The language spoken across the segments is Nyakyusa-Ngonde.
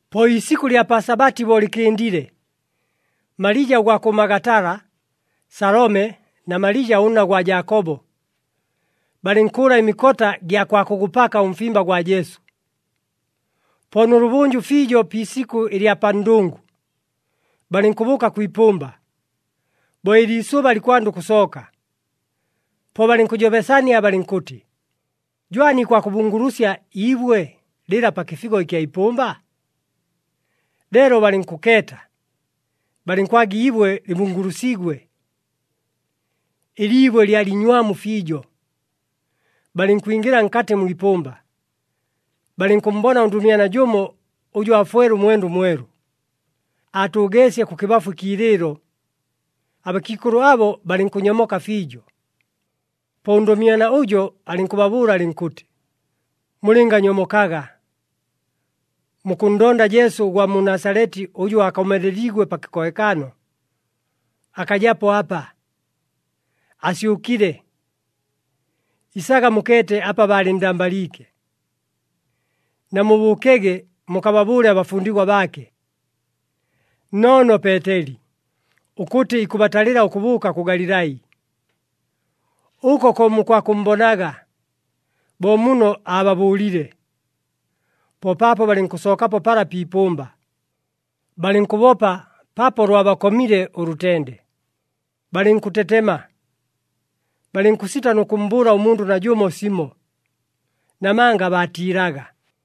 Po iisikʉ ɨlya pa Sabati bo lɨkɨndile, Malija ʉgwa kʉ Magatala, Salome na Malija ʉnna gwa Jaakobo, balɨnkʉʉla ɨmikota gya kwa kʉgʉpaka ʉmfimba gwa Jesu. Po nʉlʉbʉnjʉ fiijo pi isikʉ ɨlya pa ndʉngʉ, balɨnkʉbʉʉka kwi ipʉmba, bo ɨliisʉba likwanda ʉkʉsooka. Po balɨnkʉjobesania balɨnkʉtɨ, “Jwani, ikwakʉbungulusya iibwe lɨla pa kɨfigo ɨkya ipʉmba?” Leelo balɨnkʉkeeta, balɨnkwaga iibwe lɨbungulusiigwe. Ɨliibwe lyalɨ inywamu fiijo. Balɨnkwingɨla nkatɨ mwi ipʉmba, balɨnkʉmmbona ʉndʉmyana jʉmo ʉjʉ aafwele ʉmwenda ʉmwelu. Aatʉʉgeesye kʉkɨbafu ɨkiilɨɨlo. Abakiikʉlʉ abo balɨnkʉnyomoka fiijo. Po ʉndʉmyana ʉjo alɨnkʉbabʉʉla alɨnkʉtɨ, “Mulɨnganyomokaga. Mukʉnndonda Jesu ʉgwa mu Nasaleti ʉjʉ aakomeleliigwe pa kɨkohekano. Akajapo apa! Asyʉkile! Isaga mukeete apa baalɨnndambaliike. Namubʉʉkege mukababʉʉle abafundigwa baake, nnoono Peeteli, ʉkʉtɨ ikʉbatalɨla ʉkʉbʉʉka kʉ Galilai. Ʉko ko mukwakʉmmbonaga, bo muno aababʉʉlile.” Po paapo balɨnkʉsookapo pala pi ipʉmba, balɨnkʉbopa paapo lwabakomile ʉlʉtende, balɨnkʉtetema. Balɨnkʉsita nʉ kʉmmbʉʉla ʉmundʉ najʉmo simo, namanga baatiilaga. [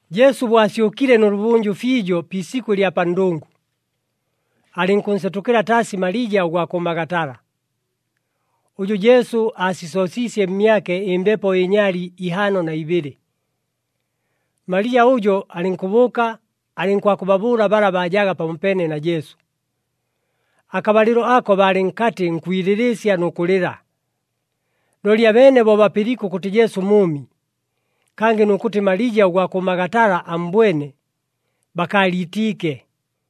Jesu bo asyʉkile nʉlʉbʉnjʉ fiijo pi isikʉ ɨlya pa ndʉngʉ, alɨnkʉnsetʉkɨla taasi Malija ʉgwa kʉ Magatala, ʉjʉ Jesu aasisoosiisye mmyake ɨmbepo ɨnyali ihaano na ibɨlɨ. Malija ʉjo alɨnkʉbʉʉka alɨnkwakʉbabʉʉla bala baajaga pamopeene na Jesu. Akabalɨlo ako baalɨ nkatɨ nkwilɨlɨɨsya nʉ kʉlɨla. Looli abeene bo bapɨliike ʉkʉtɨ Jesu mʉʉmi, kangɨ nʉ kʉtɨ Malija ʉgwa kʉ Magatala ammbwene, bakaaliitiike.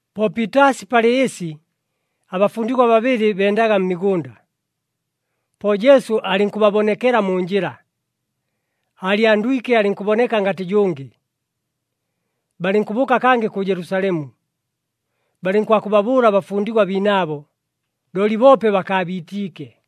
Po piitaasi palɨ ɨsi, abafundigwa babɨlɨ bendaga mmigʉnda. Po Jesu alɨnkʉbabonekela mu njɨla, aalyandwike alɨnkʉboneka ngatɨ jʉngɨ. Balɨnkʉbʉʉka kangɨ kʉ Jelusalemu, balɨnkwakʉbabʉʉla abafundigwa biinaabo, looli boope bakaabiitiike.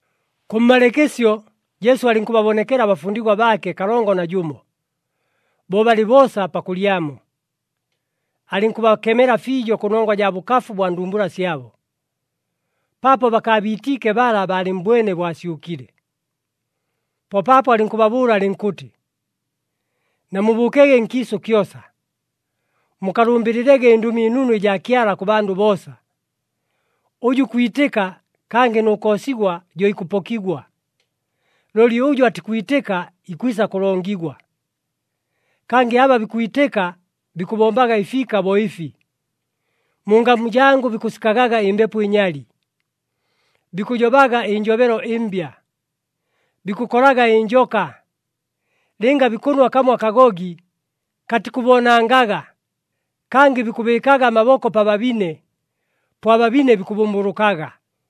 Kʉmmalɨɨkɨsyo, Jesu alɨnkʉbabonekela abafundigwa baake kalongo na jʉmo, bo balɨ boosa pakʉlyamo. Alɨnkʉbakemela fiijo kʉnongwa jaa bʉkafu bwa ndumbula syabo, paapo bakaabiitiike bala baalɨmmbwene bo asyʉkile. Po paapo alɨnkʉbabʉʉla alɨnkʉtɨ, “Namubʉʉkege nkiisʉ kyosa, mukalʉmbɨlɨlege ɨNdʉmi ɨNunu ɨjaa Kyala kʉ bandʉ boosa! Ʉjʉ ikwitɨka, kangɨ nʉ koosigwa, jo ikʉpokigwa. Looli ʉjʉ atikwitɨka ikwisa kʉlongigwa. Kangɨ aba bikwitɨka, bikʉbombaga ɨfiika bo ɨfi. Mu ngamu jangʉ bikʉsikagaga ɨmbepo ɨnyali, bikʉjobaga ɨnjobelo ɨmbya, bikʉkolaga ɨnjoka, lɨnga bikʉnwa kamo akagogi, katikʉboonangaga, kangɨ bikʉbɨɨkaga amaboko pa babine, po ababine bikʉbʉmbʉlʉkaga.”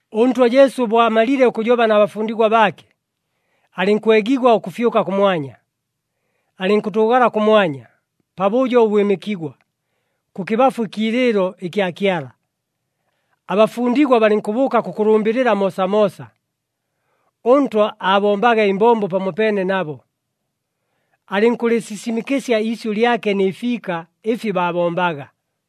ɄNtwa Jesu bo amalile ʉkʉjoba na bafundigwa baake, alɨnkwegigwa ʉkʉfyʉka kʉmwanya. Alɨnkʉtʉʉgala kʉmwanya, pabʉjo ʉbwɨmɨkigwa, kʉkɨbafu ɨkiilɨɨlo ɨkya Kyala. Abafundigwa balɨnkʉbʉʉka kʉkʉlʉmbɨlɨla moosamoosa. ɄNtwa aabombaga ɨmbombo pamopeene nabo, alɨnkʉlɨsisimɨkɨsya iisyʉ lyake nɨ fiika ɨfi baabombaga.]